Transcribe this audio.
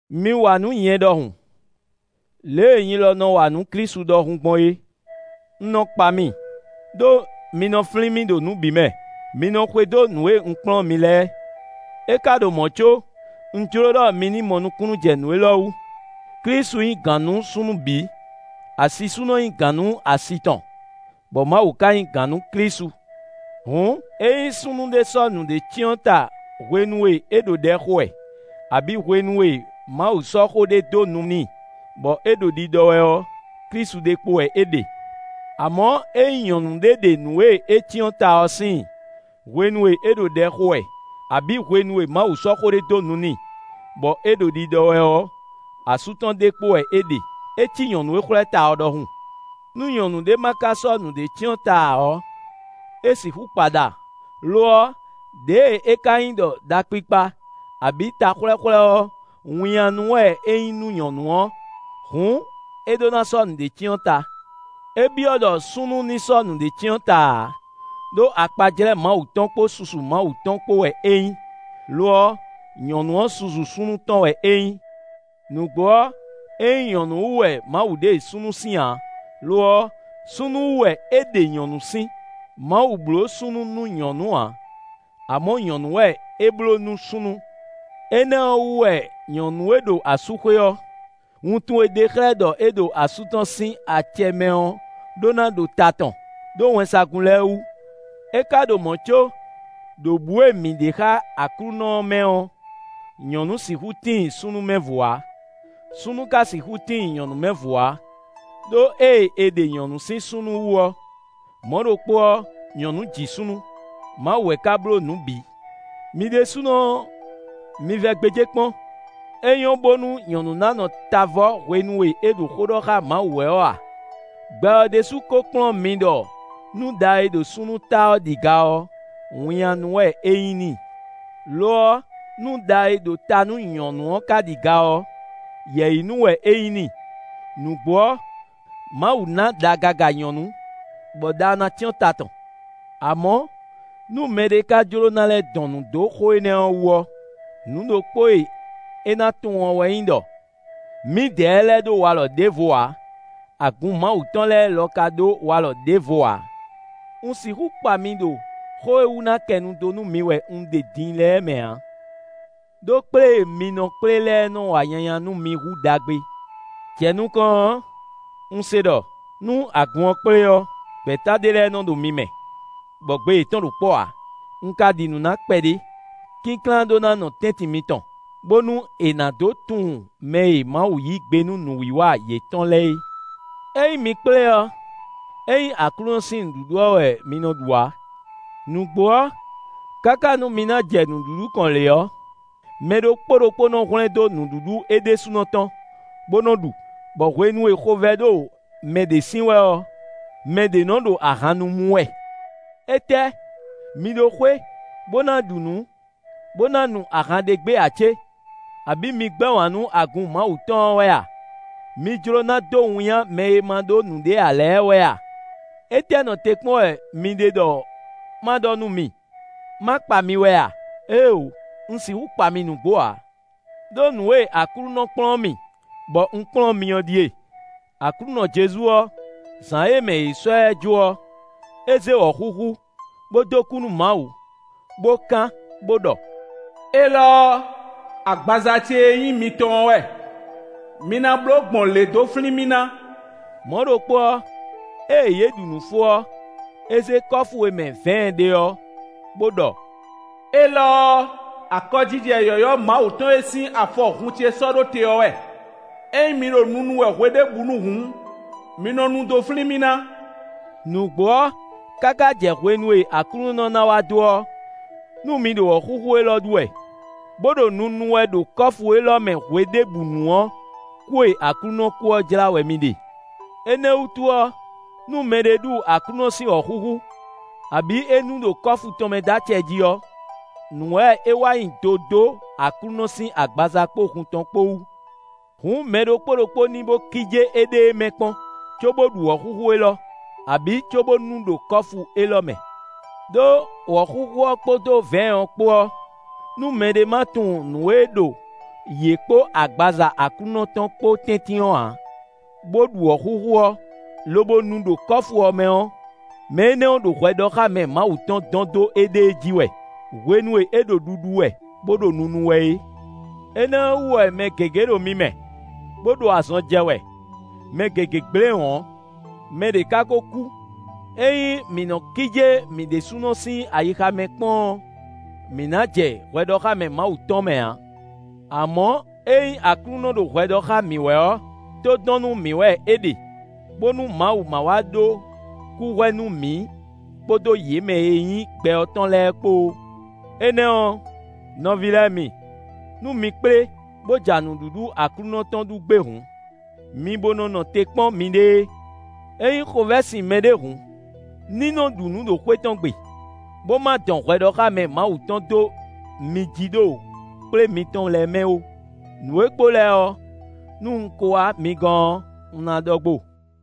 Mi wa nǔ nyɛ ɖɔhun, lě e nyi lɔ nɔ wa nǔ Klísu ɖɔhun gbɔn é. Un nɔ kpa mi, ɖó mi nɔ flín mì ɖo nǔ bǐ mɛ; mi nɔ xwedó nǔ e un kplɔ́n mi lɛ́ɛ. É ka ɖo mɔ̌ có, un jló ɖɔ mi ní mɔ nukúnnú jɛ nǔ élɔ́ wú: Klísu nyí gǎn nú súnnu bǐ; asisúnɔ nyí gǎn nú asi tɔn, bɔ Mawu ka nyí gǎn nú Klísu. Hǔn, ényí súnnu ɖé sɔ́ nǔɖé cyɔ́n ta hwenu e é ɖo ɖɛ xo wɛ, abǐ hwenu e Mawu sɔ́ xó ɖé dó nu n'i, bɔ é ɖo ɖiɖɔ wɛ ɔ́, Klísu ɖe kpo wɛ é ɖe. Amɔ̌, ényí nyɔ̌nu ɖé ɖe nǔ e é cyɔ́n ta ɔ́ síin, hwenu e é ɖo ɖɛ xo wɛ, abǐ hwenu e Mawu sɔ́ xó ɖé dó nu n'i, bɔ é ɖo ɖiɖɔ wɛ ɔ́, asú tɔn ɖe kpo wɛ é ɖe; é cí nyɔ̌nu e xwlɛ́ ta ɔ́ ɖɔhun. Nú nyɔ̌nu ɖé ma ka sɔ́ nǔɖé cyɔ́n ta ǎ ɔ́, é sixú kpa ɖa. Lo ɔ́, ɖěe é ka nyí ɖɔ ɖa kpikpa, abǐ ta xwlɛ́xwlɛ́ ɔ́, winnyánú wɛ é nyí nú nyɔ̌nu ɔ́, hǔn é ɖó ná sɔ́ nǔɖé cyɔ́n ta. É byɔ́ ɖɔ súnnu ní sɔ́ nǔɖé cyɔ́n ta ǎ; ɖó akpajlɛ́ Mawu tɔn kpó susu Mawu tɔn kpó wɛ é nyí; lo ɔ́, nyɔ̌nu ɔ́ susu súnnu tɔn wɛ é nyí. Nǔgbó ɔ́, é nyí nyɔ̌nu wú wɛ Mawu ɖe súnnu sín ǎ; lo ɔ́, súnnu wú wɛ é ɖe nyɔ̌nu sín. Mawu bló súnnu nú nyɔ̌nu ǎ; amɔ̌ nyɔ̌nu wɛ é bló nú súnnu. Énɛ́ ɔ́ wú wɛ nyɔ̌nu e ɖo asúxwé ɔ́, wuntun e ɖe xlɛ́ ɖɔ é ɖo asú tɔn sín acɛ mɛ ɔ́ ɖó ná ɖo ta tɔn ɖó wɛnsagun lɛ́ɛ wú. É ka ɖo mɔ̌ có, ɖo bǔ e mǐ ɖe xá Aklúnɔ ɔ́ mɛ ɔ́, nyɔ̌nu sixú tíin súnnu mɛ vo ǎ; súnnu ka sixú tíin nyɔ̌nu mɛ vo ǎ. Đó ée è ɖe nyɔ̌nu sín súnnu wú ɔ́, mɔ̌ ɖokpó ɔ́, nyɔ̌nu ji súnnu. Mawu wɛ ka bló nǔ bǐ. Mi ɖésúnɔ ɔ́, mi vɛ gbéjé kpɔ́n: é nyɔ́ bónú nyɔ̌nu ná nɔ ta vɔ́ hwenu e é ɖo xó ɖɔ xá Mawu wɛ ɔ́ a? Gbɛ ɔ́ ɖésú ko kplɔ́n mi ɖɔ nú ɖa e ɖo súnnu ta ɔ́ ɖi ga ɔ́, winnyánú wɛ é nyí n'i. Lo ɔ́, nú ɖa e ɖo ta nú nyɔ̌nu ɔ́ ka ɖi ga ɔ́, yɛ̌yinú wɛ é nyí n'i. Nǔgbó ɔ́, Mawu ná ɖa gaga nyɔ̌nu, bɔ ɖa ɔ́ ná cyɔ́n ta tɔn. Amɔ̌, nú mɛɖé ka jló ná lɛ́ dɔn nǔ dó xó énɛ́ ɔ́ wú ɔ́, nǔ ɖokpó e é ná tunwun ɔ́ wɛ nyí ɖɔ: mǐdɛɛ lɛ́ɛ ɖó walɔ ɖěvo ǎ; agun Mawu tɔn lɛ́ɛ lɔ ka ɖó walɔ ɖěvo ǎ. Un sixú kpa mi ɖo xó e wú ná kɛ nu dó nú mi wɛ un ja din lɛ́ɛ mɛ ǎ, ɖó kplé e mi nɔ kplé lɛ́ɛ nɔ wa nyanya nú mi hú ɖagbe. Jɛ nukɔn ɔ́, un se ɖɔ, nú agun ɔ́ kplé ɔ́, gbɛ̌ta ɖé lɛ́ɛ ɖo mi mɛ, bɔ gbe yětɔn ɖo kpɔ́ ǎ. Un ka ɖi nǔ na kpɛɖé. Kínklán ɖó ná nɔ tɛ́ntin mitɔn, bónú è nǎ dǒ tunwun mɛ e Mawu yí gbe nú nǔwiwa yětɔn lɛ́ɛ é. Ényí mi kplé ɔ́, é nyí Aklúnɔ sín nǔɖuɖu ɔ́ wɛ mi nɔ ɖu ǎ. Nǔgbó ɔ́, káká nú mi ná jɛ nǔɖuɖu kɔn lě ɔ́, mɛ ɖokpó ɖokpó nɔ hwlɛ́ndó nǔɖuɖu é ɖésúnɔ tɔn, bó nɔ ɖu, bɔ hwenu e xovɛ́ ɖo mɛ ɖě sin wɛ ɔ́, mɛ ɖě nɔ ɖo ahan nu mú wɛ. Étɛ́! Mi ɖó xwé, bó ná ɖu nǔ, bó ná nu ahan ɖ'é gbe ǎ cé? Abǐ mi gbɛ́ wǎn nú agun Mawu tɔn ɔ́ wɛ a? Mi jló ná dó winnyá mɛ e ma ɖó nǔɖé ǎ lɛ́ɛ wɛ a? Étɛ́ nɔ te kpɔ́n wɛ mi ɖe ɖɔ ma ɖɔ nú mi? Má kpa mi wɛ a? Éeǒ! Un sixú kpa mi nǔgbó ǎ! Đó nǔ e Aklúnɔ kplɔ́n mì bɔ un kplɔ́n mi ɔ́ ɖíe: Aklúnɔ Jezu ɔ́, zǎn e mɛ è sɔ́ ɛ jó ɔ́, é zé wɔ̌xúxú, bó dó kú nú Mawu, bó kán, bó ɖɔ: “Élɔ́ ɔ́, agbaza ce e nyí mitɔn ɔ́ wɛ; mi ná nɔ bló gbɔn lě dó flín mì ná.” Mɔ̌ ɖokpó ɔ́, ée yě ɖu nǔ fó ɔ́, é zé kɔ́fu e mɛ vɛ̌ɛn ɖe ɔ́, bó ɖɔ: “Élɔ́ ɔ́, akɔjijɛ yɔ̌yɔ́ Mawu tɔn e sín afɔ hun ce sɔ́ ɖó te ɔ́ wɛ. Ényí mi ɖo nunu wɛ hweɖěbǔnu hǔn, mi nɔ nu dó flín mì ná.” Nǔgbó ɔ́, káká jɛ hwenu e Aklúnɔ ná wá dó ɔ́, nú mi ɖo wɔ̌xúxú élɔ́ ɖu wɛ, bó ɖo nunu wɛ ɖo kɔ́fu élɔ́ mɛ hweɖěbǔnu ɔ́, kú e Aklúnɔ kú ɔ́ jlá wɛ mi ɖe. Énɛ́ wútu ɔ́, nú mɛɖé ɖu Aklúnɔ sín wɔ̌xúxú, abǐ é nu ɖo kɔ́fu tɔn mɛ dó acɛ jí ɔ́, nǔ wɛ é wa nyi do dó Aklúnɔ sín agbaza kpó hun tɔn kpó wú. Hǔn mɛ ɖokpó ɖokpó ní bó kíjé éɖée mɛ kpɔ́n, cóbó ɖu wɔ̌xúxú élɔ́, abǐ cóbó nu ɖo kɔ́fu élɔ́ mɛ. Đó, wɔ̌xúxú ɔ́ kpódó vɛ̌ɛn ɔ́ kpó ɔ́, nú mɛɖé ma tunwun nǔ e ɖo yě kpó agbaza Aklúnɔ tɔn kpó tɛ́ntin ɔ́ ǎ, bó ɖu wɔ̌xúxú ɔ́, lobo nu ɖo kɔ́fu ɔ́ mɛ ɔ́, mɛ énɛ́ ɔ́ ɖo hwɛɖɔxámɛ Mawu tɔn dɔn dó éɖée jí wɛ, hwenu e é ɖo ɖuɖu wɛ, bó ɖo nunu wɛ é. Énɛ́ ɔ́ wú wɛ mɛ gěgé ɖo mi mɛ, bó ɖo azɔn jɛ wɛ; mɛ gěgé gblé wɔ̌n; mɛ ɖě ká ko kú. Ényí mǐ nɔ kíjé mǐ ɖésúnɔ sín ayixa mɛ kpɔ́n ɔ́, mǐ ná jɛ hwɛɖɔxámɛ Mawu tɔn mɛ ǎ. Amɔ̌, ényí Aklúnɔ ɖo hwɛ ɖɔ xá mǐ wɛ ɔ́, tó dɔn nú mǐ wɛ é ɖe, bónú Mawu ma wá ɖó kúhwɛ nú mǐ kpódó yě mɛ e nyí gbɛ ɔ́ tɔn lɛ́ɛ kpó ó. Énɛ́ ɔ́, nɔví lɛ́ɛ mi, nú mi kplé, bó ja nǔɖuɖu Aklúnɔ tɔn ɖu gbé hǔn, mi bo nɔ nɔ te kpɔ́n miɖée. Ényí xovɛ́ sin mɛɖé hǔn, ní nɔ ɖu nǔ ɖo xwé tɔn gbe, bó ma dɔn hwɛɖɔxámɛ Mawu tɔn dó mi jí ɖo kplé mitɔn lɛ́ɛ mɛ ó. Nǔ e kpo lɛ́ɛ ɔ́, nú un ko wá mi gɔ́n ɔ́, un ná ɖɔ gbo.